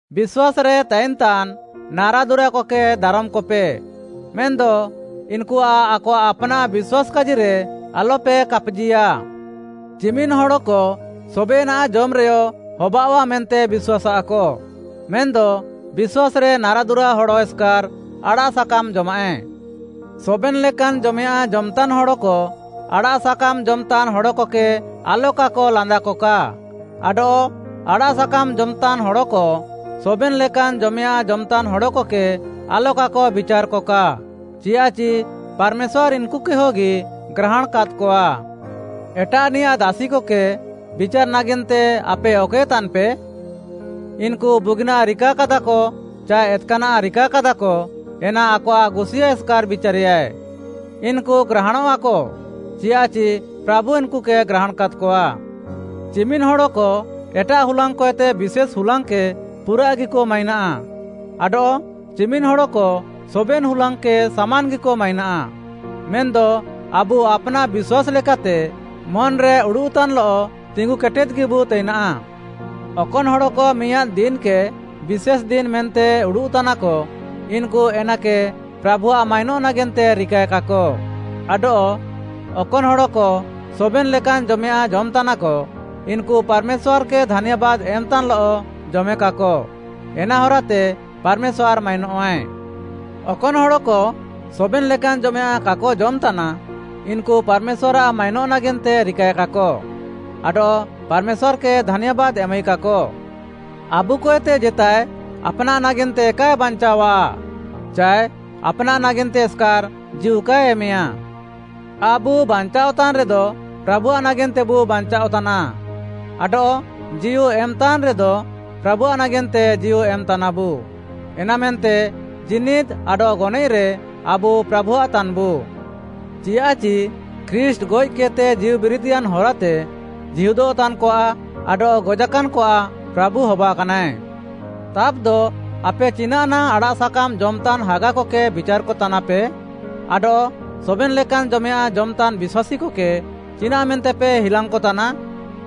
ବିଶ୍ୱାସ୍‌ରେ ତାଇନ୍‌ତାନ୍‌ ନାରାଦୁରାକକେ ଦାରମ୍‌କପେ, ମେନ୍‌ଦ ଇନ୍‌କୁଆଃ ଆକଆଃ ଆପ୍‌ନାଃ ବିଶ୍ୱାସ୍‌ କାଜିରେ ଆଲପେ କାପ୍‌ଜିଆଃ। ଚିମିନ୍‌ ହଡ଼କ ସବେନାଃ ଜମ୍‌ରେୟ ହବାଅଃଆ ମେନ୍ତେ ବିଶ୍ୱାସ୍‌ଆଃକ, ମେନ୍‌ଦ ବିଶ୍ୱାସ୍‌ରେ ନାରାଦୁରା ହଡ଼ ଏସ୍‌କାର୍‌ ଆଡ଼ାଃସାକାମ୍‌ ଜଜମାଃଏ। ସବେନ୍‌ ଲେକାନ୍‌ ଜମେୟାଃଁ ଜମ୍‌ତାନ୍‌ ହଡ଼କ, ଆଡ଼ାଃସାକାମ୍‌ ଜମ୍‌ତାନ୍‌ ହଡ଼କକେ ଆଲକାକ ଲାନ୍ଦାକକା, ଆଡଃ ଆଡ଼ାଃସାକାମ୍‌ ଜମ୍‌ତାନ୍‌ ହଡ଼କ, ସବେନ୍‌ ଲେକାନ୍‌ ଜମେୟାଁଃ ଜମ୍‌ତାନ୍‌ ହଡ଼କକେ ଆଲକାକ ବିଚାର୍‌କକା, ଚିଆଃଚି ପାର୍‌ମେଶ୍ୱାର୍‌ ଇନ୍‌କୁକେହଗି ଗ୍ରାହାଣ୍‌କାଦ୍‌କଆ। ଏଟାଃନିୟାଃ ଦାସିକକେ ବିଚାର୍‌ ନାଗେନ୍ତେ ଆପେ ଅକଏ ତାନ୍‌ପେ? ଇନ୍‌କୁ ବୁଗିନାଃ ରିକାକାଦାକ ଚାଏ ଏତ୍‌କାନାଃ ରିକାକାଦାକ ଏନା ଆକଆଃ ଗୁସିୟାଁ ଏସ୍‌କାର୍‌ ବିଚାରେୟାଏ। ଇନ୍‌କୁ ଗ୍ରାହାଣଃଆକ ଚିଆଃଚି ପ୍ରାଭୁ ଇନ୍‌କୁକେ ଗ୍ରାହାଣ୍‌କାଦ୍‌କଆ। ଚିମିନ୍‌ ହଡ଼କ ଏଟାଃ ହୁଲାଙ୍ଗ୍‌କଏତେ ବିଶେଷ୍‌ ହୁଲାଙ୍ଗ୍‌କେ ପୁରାଃଗିକ ମାଇନାଃ, ଆଡଃ ଚିମିନ୍‌ ହଡ଼କ ସବେନ୍‌ ହୁଲାଙ୍ଗ୍‌କେ ସାମାନ୍‌ଗିକ ମାଇନାଃ। ମେନ୍‌ଦ ଆବୁ ଆପ୍‌ନାଃ ବିଶ୍ୱାସ୍‌ ଲେକାତେ ମନ୍‌ରେ ଉଡ଼ୁଃତାନ୍‌ଲଃ ତିଙ୍ଗୁକେଟେଦ୍‌ଗିବୁ ତାଇନାଃ। ଅକନ୍‌ ହଡ଼କ ମିଆଁଦ୍‌ ଦିନ୍‌କେ ବିଶେଷ୍‌ ଦିନ୍‌ ମେନ୍ତେ ଉଡ଼ୁଃତାନାକ, ଇନ୍‌କୁ ଏନାକେ ପ୍ରାଭୁଆଃ ମାଇନଃ ନାଗେନ୍ତେ ରିକାଏକାକ, ଆଡଃ ଅକନ୍‌ ହଡ଼କ ସବେନ୍‌ ଲେକାନ୍‌ ଜମେୟାଁଃ ଜମ୍‌ତାନାକ, ଇନ୍‌କୁ ପାର୍‌ମେଶ୍ୱାର୍‌କେ ଧାନ୍ୟାବାଦ୍‌ ଏମ୍‌ତାନ୍‌ଲଃ ଜମେକାକ, ଏନା ହରାତେ ପାର୍‌ମେଶ୍ୱାର୍‌ ମାଇନଃଆଏ। ଅକନ୍‌ ହଡ଼କ ସବେନ୍‌ ଲେକାନ୍‌ ଜମେୟାଁଃ କାକ ଜମ୍‌ତାନା, ଇନ୍‌କୁ ପାର୍‌ମେଶ୍ୱାର୍‌ଆଃ ମାଇନଃ ନାଗେନ୍ତେ ରିକାଏକାକ ଆଡଃ ପାର୍‌ମେଶ୍ୱାର୍‌କେ ଧାନ୍ୟାବାଦ୍‌ ଏମାଇକାକ। ଆବୁକଏତେ ଜେତାଏ ଆପ୍‌ନାଃ ନାଗେନ୍ତେ କାଏ ବାଞ୍ଚାଅଃଆ ଚାଏ ଆପ୍‌ନାଃ ନାଗେନ୍ତେ ଏସ୍‌କାର୍‌ ଜୀଉ କାଏ ଏମେୟା। ଆବୁ ବାଞ୍ଚାଅଃତାନ୍‌ ରେଦ ପ୍ରାଭୁଆଃ ନାଗେନ୍ତେବୁ ବାଞ୍ଚାଅଃତାନା, ଆଡଃ ଜୀଉ ଏମ୍‌ତାନ୍‌ରେଦ ପ୍ରାଭୁଆଃ ନାଗେନ୍ତେ ଜୀଉ ଏମ୍‌ତାନାବୁ। ଏନାମେନ୍ତେ ଜୀନିଦ୍‌ ଆଡଃ ଗନଏଃରେ ଆବୁ ପ୍ରାଭୁଆଃତାନ୍‌ବୁ। ଚିୟାଃଚି ଖ୍ରୀଷ୍ଟ୍‌ ଗଏଃକେଦ୍‌ତେ ଜୀଉବିରିଦ୍‌ୟାନ୍‌ ହରାତେ ଜୀହୁଦଃତାନ୍‌କଆଃ ଆଡଃ ଗଜାକାନ୍‌କଆଃ ପ୍ରାଭୁ ହବାକାନାଏ। ତାବ୍‌ଦ ଆପେ ଚିନାଃ ନାଙ୍ଗ୍‌ ଆଡ଼ାଃସାକାମ୍‌ ଜମ୍‌ତାନ୍‌ ହାଗାକକେ ବିଚାର୍‌କତାନାପେ? ଆଡଃ ସବେନ୍‌ ଲେକାନ୍‌ ଜମେୟାଁଃ ଜମ୍‌ତାନ୍‌ ବିଶ୍ୱାସୀକକେ ଚିନାଃମେନ୍ତେପେ ହିଲାଙ୍ଗ୍‌କତାନା?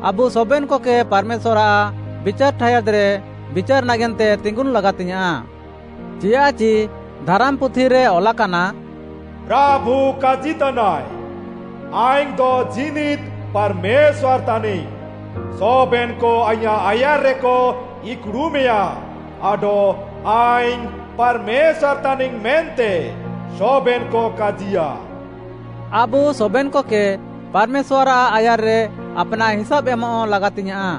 ଆବୁ ସବେନ୍‌କକେ ପାର୍‌ମେଶ୍ୱାର୍‌ଆଃ ବିଚାର୍‌ ଠାୟାଦ୍‌ରେ ବିଚାର୍‌ ନାଗେନ୍ତେ ତିଙ୍ଗୁନ୍‌ ଲାଗାତିଙ୍ଗ୍‌ୟାଁଃ। ଚିୟାଃଚି ଧାରାମ୍‌ପୁଥିରେ ଅଲାକାନା, “ପ୍ରାଭୁ କାଜିତାନାଏ, ଆଇଙ୍ଗ୍‌ଦ ଜୀନିଦ୍‌ ପାର୍‌ମେଶ୍ୱାର୍‌ ତାନିଙ୍ଗ୍‌, ସବେନ୍‌କ ଆଇଁୟାଃ ଆୟାର୍‌ରେକ ଇକ୍‌ଡ଼ୁମେଆ, ଆଡଃ ଆଇଙ୍ଗ୍‌ ପାର୍‌ମେଶ୍ୱାର୍‌ ତାନିଙ୍ଗ୍‌ ମେନ୍ତେ ସବେନ୍‌କ କାଜିୟା।” ଆବୁ ସବେନ୍‌କକେ ପାର୍‌ମେଶ୍ୱାର୍‌ଆଃ ଆୟାର୍‌ରେ ଆପ୍‌ନାଃ ହିସାବ୍‌ ଏମଃ ଲାଗାତିଙ୍ଗ୍‌ୟାଁଃ।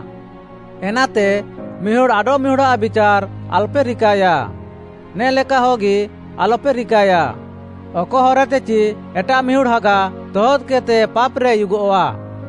ଏନାତେ ମିହୁଡ଼୍‌ ଆଡଃମିହୁଡ଼୍‌ଆଃ ବିଚାର୍‌ ଆଲ୍‌ପେ ରିକାଏୟା, ନେ'ଲେକାହଗି ଆଲପେ ରିକାଏ, ଅକ ହରାତେ ଚି ଏଟାଃମିହୁଡ଼୍‌ ହାଗା ତହଦ୍‌କେଦ୍‌ତେ ପାପ୍‌ରେ ଉୟୁଗଃଆ।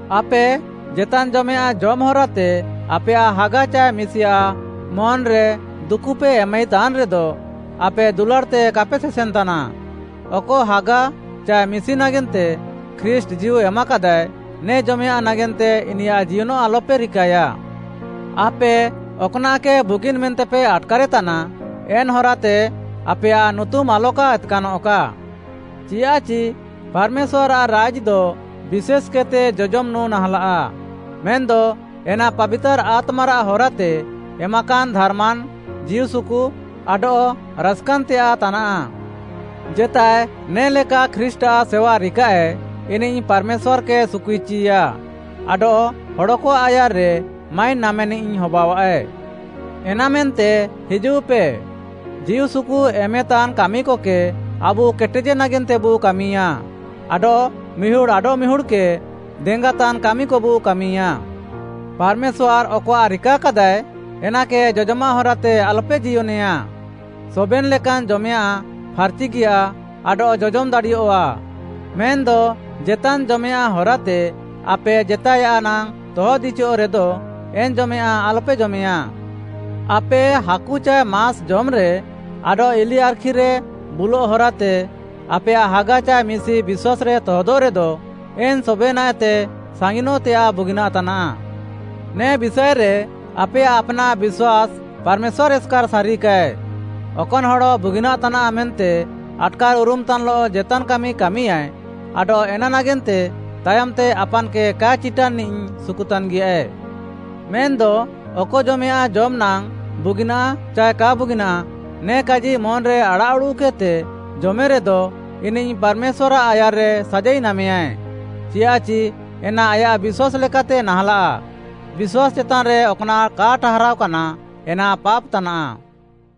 ଆପେ ଜେତାନ୍‌ ଜମେୟାଁଃ ଜମ୍‌ ହରାତେ ଆପେୟାଃ ହାଗା ଚାଏ ମିଶିଆଃ ମନ୍‌ରେ ଦୁକୁପେ ଏମାଇତାନ୍‌ରେଦ, ଆପେ ଦୁଲାଡ଼୍‌ତେ କାପେ ସେସେନ୍‌ତାନା। ଅକ ହାଗା ଚାଏ ମିଶି ନାଗେନ୍ତେ ଖ୍ରୀଷ୍ଟ୍‌ ଜୀଉ ଏମ୍‌କେଦାଏ, ନେ ଜମେୟାଁଃ ନାଗେନ୍ତେ ଇନିୟାଃ ଜିୟନଃ ଆଲପେ ରିକାଏୟା। ଆପେ ଅକ୍‌ନାଃକେ ବୁଗିନ୍‌ ମେନ୍ତେପେ ଆଟ୍‌କାରେତାନା, ଏନ୍‌ ହରାତେ ଆପେୟାଃ ନୁତୁମ୍‌ ଆଲକା ଏତ୍‌କାନଃକା। ଚିଆଃଚି ପାର୍‌ମେଶ୍ୱାର୍‌ଆଃ ରାଇଜ୍‌ଦ ବିଶେଷ୍‌କେଦ୍‌ତେ ଜଜମ୍‌ ନୁଁ ନାହାଁଲାଃ, ମେନ୍‌ଦ ଏନା ପାବିତାର୍‌ ଆତ୍ମାରାଃ ହରାତେ ଏମାକାନ୍‌ ଧାର୍‌ମାନ୍‌, ଜୀଉସୁକୁ ଆଡଃ ରାସ୍‌କାନ୍‌ତେୟାଃ ତାନାଃ। ଜେତାଏ ନେ'ଲେକା ଖ୍ରୀଷ୍ଟ୍‌ଆଃ ସେୱା ରିକାଃଏ, ଇନିଃ ପାର୍‌ମେଶ୍ୱାର୍‌କେ ସୁକୁଇଚିୟା ଆଡଃ ହଡ଼କଆଃ ଆୟାର୍‌ରେ ମାଇନ୍‌ ନାମେନିଃ ହବାଅଃଆଏ। ଏନାମେନ୍ତେ ହିଜୁଃପେ, ଜୀଉସୁକୁ ଏମେତାନ୍‌ କାମିକକେ ଆବୁ କେଟେଜେ ନାଗେନ୍ତେବୁ କାମିୟା ଆଡଃ ମିହୁଡ଼୍‌ ଆଡଃମିହୁଡ଼୍‌କେ ଦେଙ୍ଗାତାନ୍‌ କାମିକବୁ କାମିୟା। ପାର୍‌ମେଶ୍ୱାର୍‌ ଅକଆଃ ରିକାକାଦାଏ ଏନାକେ ଜଜମାଃ ହରାତେ ଆଲପେ ଜିୟନେଆ। ସବେନ୍‌ ଲେକାନ୍‌ ଜମେୟାଁଃ ଫାର୍‌ଚିଗିୟା ଆଡଃ ଜମ୍‌ ଦାଡ଼ିଅଃଆ, ମେନ୍‌ଦ ଜେତାନ୍‌ ଜମେୟାଁଃ ହରାତେ ଆପେ ଜେତାଏୟାଃ ନାଙ୍ଗ୍‌ ତହଦ୍‌ଇଚିୟଃ ରେଦ ଏନ୍‌ ଜମେୟାଁଃ ଆଲପେ ଜମେୟାଁ। ଆପେ ହାକୁ ଚାଏ ମାସ୍‌ ଜମ୍‌ରେ ଆଡଃ ଇଲିଆର୍‌ଖିରେ ବୁଲଃ ହରାତେ ଆପେୟାଃ ହାଗା ଚାଏ ମିଶି ବିଶ୍ୱାସ୍‌ରେ ତହଦଃରେଦ, ଏନ୍‌ ସବେନାଃଏତେ ସାଙ୍ଗିନଃତେୟାଃ ବୁଗିନାଃ ତାନାଃ। ନେ ବିଷାଏରେ ଆପେୟାଃ ଆପ୍‌ନାଃ ବିଶ୍ୱାସ୍‌ ପାର୍‌ମେଶ୍ୱାର୍‌ ଏସ୍‌କାର୍‌ ସାରିକାଏ। ଅକନ୍‌ ହଡ଼ ବୁଗିନାଃ ତାନାଃ ମେନ୍ତେ ଆଟ୍‌କାର୍‌ଉରୁମ୍‌ତାନ୍‌ଲଃ ଜେତାନ୍‌ କାମି କାମିୟାଏ, ଆଡଃ ଏନା ନାଗେନ୍ତେ ତାୟମ୍‌ତେ ଆପାନ୍‌କେ କାଏ ଚିଟାନ୍‌ନିଃ ସୁକୁତାନ୍‌ଗିଆଏ। ମେନ୍‌ଦ ଅକ ଜମେୟାଁଃ ଜମ୍‌ ନାଙ୍ଗ୍‌ ବୁଗିନାଃ ଚାଏ କା ବୁଗିନାଃ, ନେ କାଜି ମନ୍‌ରେ ଆଡ଼ାଃଉଡ଼ୁଃକେଦ୍‌ତେ ଜମେରେଦ, ଇନିଃ ପାର୍‌ମେଶ୍ୱାର୍‌ଆଃ ଆୟାର୍‌ରେ ସାଜାଇ ନାମେୟାଏ, ଚିଆଃଚି ଏନା ଆୟାଃ ବିଶ୍ୱାସ୍‌ ଲେକାତେ ନାହାଁଲାଃ। ବିଶ୍ୱାସ୍‌ ଚେତାନ୍‌ରେ ଅକ୍‌ନାଃ କା ଠାହାରାଅକାନା ଏନା ପାପ୍‌ ତାନାଃ।